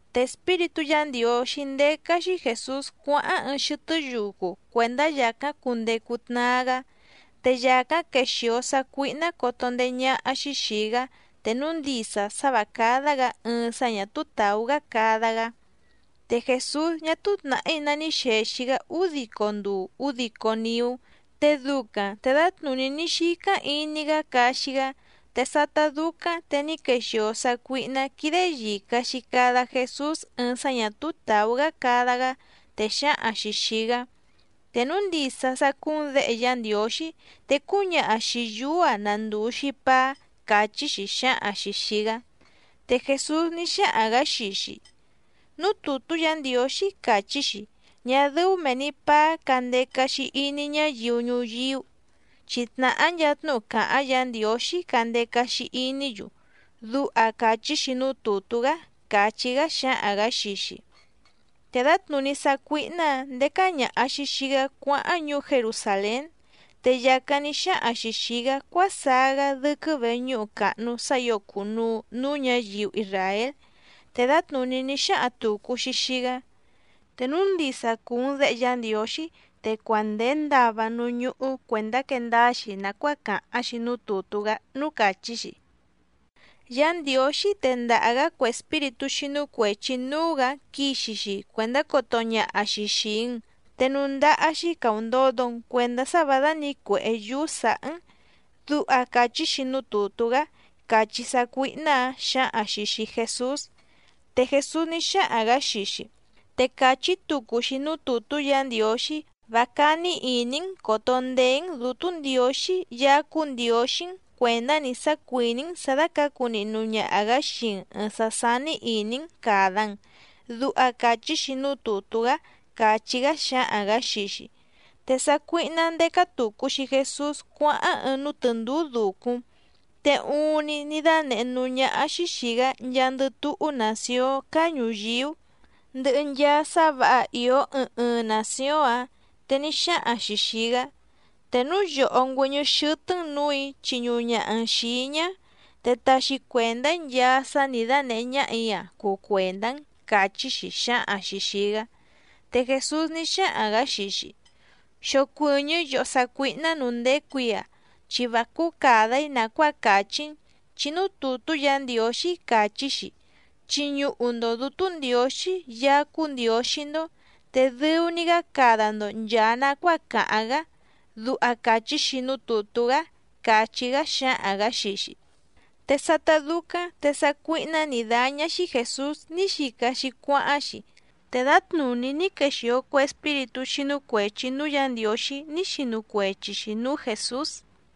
Te Espíritú Yǎ Ndiǒxí ndécá‑xí Jèsús cuáháⁿ ɨɨⁿ xɨtɨ́ yucu cuèndá yàcáⁿ cundecu tnaa‑gá, te yàcáⁿ quexìo sácuíhná coto ndeé ñáhá‑xí xìi‑gá te núu ndisa sá vǎ cádá‑gǎ ɨɨⁿ sá ñà túú tàú‑gá cada‑gá. Te Jèsús ñá ní xèxi‑gá údico nduu údico niú, te ducaⁿ te dǎtnùní ní xícáⁿ iní‑gá caxi‑gá. Te sátá dúcáⁿ te ní quexìo sácuíhná quídé yìca‑xi cada Jesús ɨɨⁿ sá ñà túú tàú‑gá cada‑gá, te xǎhaⁿ‑xi xìi‑gá: —Te núu ndisa sá cúú‑n Děhe Yá Ndiǒxí te cúñaha xìi yúú‑a na ndùu‑xi paá —càchí‑xi xǎhaⁿ‑xi xìi‑gá. Te Jèsús ní xáhaⁿ‑gǎ xii‑xi: —Núú tùtú Yǎ Ndiǒxí càchí‑xi: “Ñá dɨ́ú mèe‑ni paá candeca‑xi iní ñáyiu ñuyíú, chi tnàhá nchaa tnúhu càháⁿ Yǎ Ndiǒxí candeca‑xi iní‑yu”, duha càchí‑xi núú tùtú‑gá —càchí‑gá xǎhaⁿ‑gǎ xii‑xi. Te dǎtnùní sácuíhná‑ǎⁿ ndécá ñàha‑xi xii‑gá cuáháⁿ ñuú Jerusàlén, te yàcáⁿ ní xáhaⁿ‑xi xìi‑gá cuásaá‑gá dɨ́quɨ́ véñǔhu càhnu sá ǐo cùnuu núú ñǎyiu isràél, te dǎtnùní ní xáhaⁿ tùcu‑xi xii‑gá: —Te núu ndisa cùu‑n Déhe Yá Ndiǒxí te cuandèe ndava núú ñúhú cuèndá quee ndáá‑xi nàcuáa càháⁿ‑xi núú tùtú‑gá núú càchí‑xi: “Yá Ndiǒxí tendaha‑gǎ cue espíritú xínú cuèchi núú‑gǎ quixi‑xi cuèndá coto ñaha‑xi xìi‑n, te núú ndáhá‑xí càundodo‑n cuendá sá vǎ dánǐcuèhé yúú sǎhá‑n”, duha càchí‑xi núú tùtú‑gá —càchí sácuíhná‑ǎⁿ xǎhaⁿ‑xi xìi Jesús. Te Jèsús ní xáhaⁿ‑gǎ xii‑xi: —Te càchí tucu‑xi núú tùtú Yǎ Ndiǒxí: “Vá cání ìní‑n còto ndeé‑n Dǔtú Ndiǒxí Yaá cúú Ndiǒxí‑n cuèndá‑ni sá cuìní‑n sǎ dácǎcu nihnu ñaha‑gǎ xii‑n ɨ̀ɨⁿ sá sání ìní‑n càda‑n”, duha càchí‑xi núú tùtú‑gá —càchí‑gá xǎhaⁿ‑gǎ xii‑xi. Te sácuíhná ndécá tùcu‑xi Jesús cuáháⁿ ɨɨⁿ núú tɨ̀ndúú dùcúⁿ, te uuⁿni ní dánèhé núú ñáhá‑xí xìi‑gá nchaandɨ túhú nàcióⁿ cáá ñùyíú, ndɨhɨ nchaa sá vǎha ìó ɨɨⁿ ɨɨⁿ nàcióⁿ‑áⁿ. Te ní xáhaⁿ‑xi xìi‑gá: —Te núu yòhó ngüɨ́ñɨ́ xɨ́tɨ́‑n nǔù‑í chiñuhu ñaha‑n xìi‑í ñá, te taxi cuèndá‑í nchaa sá nǐ dánèhé ñáhà‑í‑a cuu cuèndá‑n —càchí‑xi xǎhaⁿ‑xi xìi‑gá. Te Jèsús ní xáhaⁿ‑gǎ xii‑xi: —Xocuɨ̀ñɨ́ yòhó sácuíhná nǔú ndécù‑í‑a, chi vá cúú càda‑í nàcuáa càchí‑n, chi núú tùtú Yǎ Ndiǒxí càchí‑xi: “Chiñuhu‑ndo Dǔtú Ndiǒxí Yaá cúú Ndiǒxí‑ndó, te dɨu‑ni‑gá cada‑ndo nchàa nacuáa càháⁿ‑gá”, duha càchí‑xi núú tùtú‑gá —càchí‑gá xǎhaⁿ‑gǎ xii‑xi. Te dǎtnùní sácuíhná nǐ dáñá‑xí Jèsús ní xica‑xi cuáháⁿ‑xi. Te sátá dúcáⁿ te ní quexìo cue espíritú xínú cuèchi núú Yǎ Ndiǒxí ní xinu cuechi‑xi nǔú Jèsús.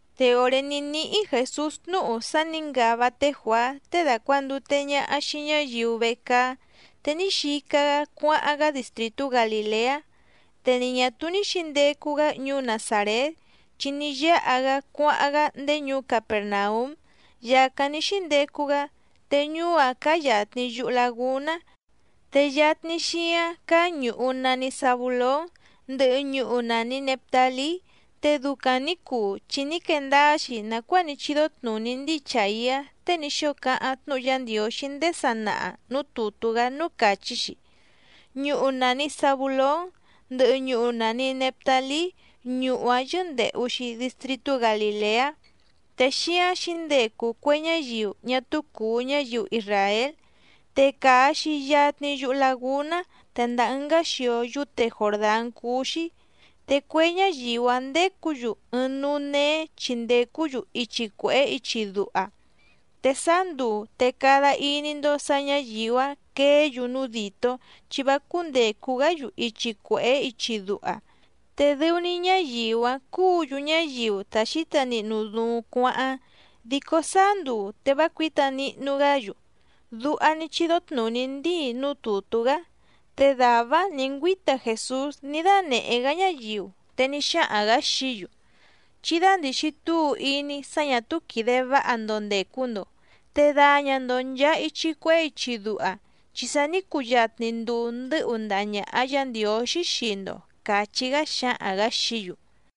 Te òré ní níhí Jèsús tnúhu sá nǐ ngava té Juàá tée dàcuandute ñaha xii ñáyiu vecaá, te ní xica‑gá cuáháⁿ‑gá distrìtú Galìleá. Te ni ñà túú ní xǐndecu‑gá ñuú Nazàrét, chi ní yáha‑gá cuáháⁿ‑gá ndéé ñuú Capèrnaúm yàcáⁿ ní xíndecu‑gá, te ñuú‑áⁿ cáá yàtni yuhu lagúná, te yatni xíáⁿ cáá ñùhu nani Zabulón, ndɨhɨ ñuhu nàni Neftalí. Te ducaⁿ nǐ cuu chi ní quee ndáá‑xi nàcuáa ní chídó tnùní ndíi Chàiá tée ní xóo cáháⁿ tnúhu Yá Ndiǒxí ndéé sanaha nǔú tùtú‑gá núú càchí‑xi: Ñuhu nàni Zabulón, ndɨhɨ ñuhu nàni Neftalí, ñuhu‑áⁿ yɨ́ndèhu‑xi distritú Galìleá, te xíáⁿ xǐndecu cue ñáyiu ñá túú cùu ñáyiu isràél, te càa‑xi yatni yuhu lagúná te ndàa ɨngá xio yúte Jòrdán cúú‑xí. Te cue ñáyiu‑áⁿ ndécǔ‑yu ɨɨⁿ núú néé chi ndècú‑yu ichi cuèhé ichi duha, te sáá nduu te cada iní‑ndó sǎ ñǎyiu‑áⁿ queé‑yu núú dìtó chi vá cúndècu‑gá‑yu ichi cuèhé ichi duha. Te dɨu‑ni ñáyiu‑áⁿ cúǔ‑yu ñáyiu ta xǐta nihnu duuⁿ cuáháⁿ, dico sáá nduu te vá cuǐta nihnu‑gá‑yu. Duha ní chídó tnùní ndíi núú tùtú‑gá. Te dàvá‑áⁿ nǐ ngüíta Jèsús ní dánèhé‑gá ñáyiu, te ní xáhaⁿ‑gǎ xií‑yu: —Chí dándìxi túu iní sá ñà túú quìde váha‑ndo ndècu‑ndo te daña‑ndo nchàa ichi cuehé ichi duha, chi sa ní cuyatni nduu ndɨ̌hu ndaha ñàha Yá Ndiǒxí xii‑ndo —càchí‑gá xǎhaⁿ‑gǎ xií‑yu.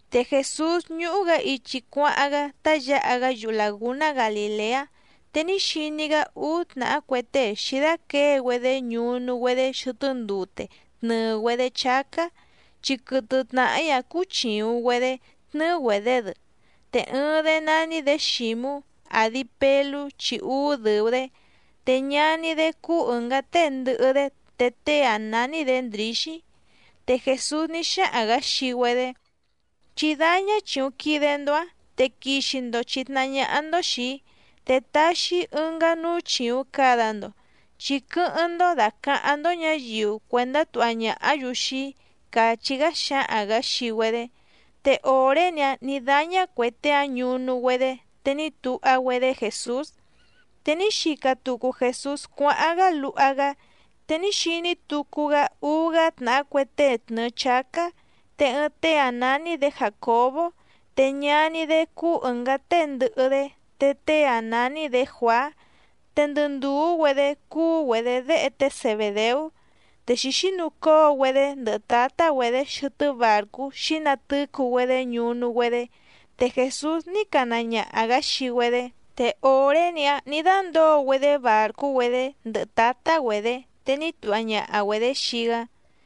Te Jèsús ñúhú‑gǎ ichi cuáháⁿ‑gá tá yǎha‑gá yuhu làgúná Galìleá, te ní xiní‑gá úú tnàhá cue tée xǐdáquěe‑güedé ñunu‑güedé xɨtɨ́ ndute tnɨ̀ɨ‑güedé chácá, chi quɨtɨ tnàhí‑áⁿ cúú chìuⁿ‑güedé tnɨ́ɨ́‑güedě‑dɨ. Te ɨɨⁿ‑dé nání‑dě Xǐmú, àdi Pelú chi úú dɨ̀u‑dé, te ñaní‑dé cúú ɨ̀ngá tée ndɨhɨ‑dé te tée‑áⁿ nání‑dě Ndrǐxí. Te Jèsús ní xáhaⁿ‑gǎ xii‑güedé: —Chí dáñá chìuⁿ quide‑ndo‑áⁿ te quixi‑ndo chìtnahá ñáhá‑ndó xìi‑í, te taxi‑í ɨngá núú chìuⁿ cada‑ndo chi quɨ́hɨ́ⁿ‑ndó dàcaháⁿ‑ndó ñǎyiu cuèndá tuha ñàhá‑yu xii‑í —càchí‑gá xǎhaⁿ‑gǎ xii‑güedé. Te òré‑ni‑áⁿ nǐ dáñá cuè tée‑áⁿ ñunu‑güedé, te ní tuha‑güedé Jèsús. Te ní xica tucu Jèsús cuáháⁿ‑gá luha‑gá, te ní xiní tucu‑gá úú‑gá tnàhá cue tée tnɨ̀ɨ chácá. Te ɨɨⁿ tée‑áⁿ nání‑dě Jàcobó, te ñaní‑dé cúú ɨ̀ngá tée ndɨhɨ‑dé te tée‑áⁿ nání‑dě Juàá, te ndɨ ndùú‑güedé cúú‑güedě déhe té Zebèdeú. Te xǐxínucóo‑güedé ndɨhɨ tǎtá‑güedě xɨtɨ́ bàrcú xǐnatɨ́cu‑güedé ñunu‑güedé, te Jèsús ní cana ñaha‑gǎ xii‑güedé. Te òré‑ni‑áⁿ nǐ dándǒo‑güedé bàrcú‑güedé, ndɨhɨ tǎtá‑güedě, te ní tuha ñaha‑güedě xii‑gá.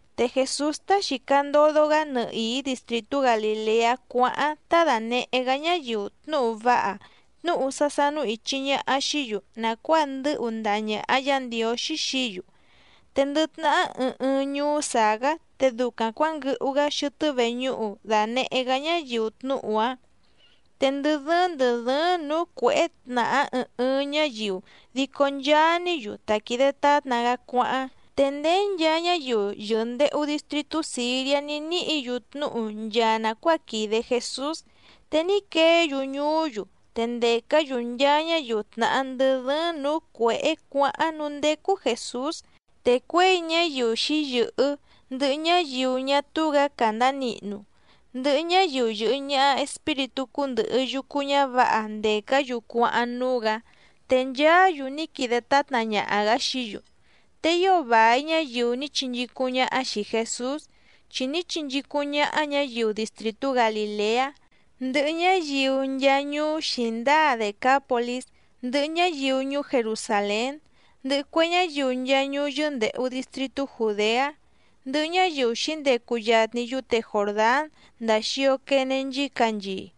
Te Jèsús tá xìca ndodo‑gá nɨhìí distrìtú Galìleá cuáháⁿ tá dànehé‑gá ñáyiu tnúhu váha tnúhu sá sánú ìchi ñaha xií‑yu nàcuáa ndɨ́hu ndaha ñàha Yá Ndiǒxí xií‑yu. Te ndɨ tnahá ɨɨⁿ ɨɨⁿ ñuú sàá‑gá te ducaⁿ cuǎnguɨhu‑gá xɨtɨ́ veñúhu dànehé‑gá ñáyiu tnúhu‑áⁿ. Te ndɨ dɨ́ɨ́ⁿ ndɨ̀ dɨ́ɨ́ⁿ nǔú cuěhé tnàhá ɨɨⁿ ɨɨⁿ ñáyiu dico nchaa‑ní‑yu ta quìde tátna‑gá cuáháⁿ. Te ndéé nchaa ñáyiu yɨ̀ndehu distritú Sìriá ní níhǐ‑yu tnúhu nchaa nàcuáa quìde Jesús. Te ní queé‑yu ñuú‑yu te ndècá‑yu nchaa ñáyiu tnàhá ndɨ dɨ́ɨ́ⁿ nǔú cuěhé cuǎháⁿ núú ndécú Jèsús. Te cuěi ñáyiu xǐyɨ̀hɨ́, ndɨhɨ ñáyiu ñá túú‑gǎ càndá nihnu, ndɨhɨ ñáyiu yɨ̀hɨ ñaha espíritú cúndɨ̀hɨ yucu ñávǎha ndècá‑yu cuáháⁿ núú‑gǎ, te nchaá‑yu ní quide tátna ñaha‑gǎ xií‑yu. Te ío vài ñáyiu ní chinchícúⁿ ñáhá xìi Jesús, chi ní chinchícúⁿ ñáhá ñǎyiu distrìtú Galìleá, ndɨhɨ ñáyiu nchaa ñuú xǐndáa Dècápolís, ndɨhɨ ñáyiu ñuú Jerusàlén, ndɨhɨ cue ñáyiu nchaa ñuú yɨ́ndèhu distritú Jùdeá, ndɨhɨ ñáyiu xǐndecu yatni yúte Jòrdán ndàa xio quene nchícanchii.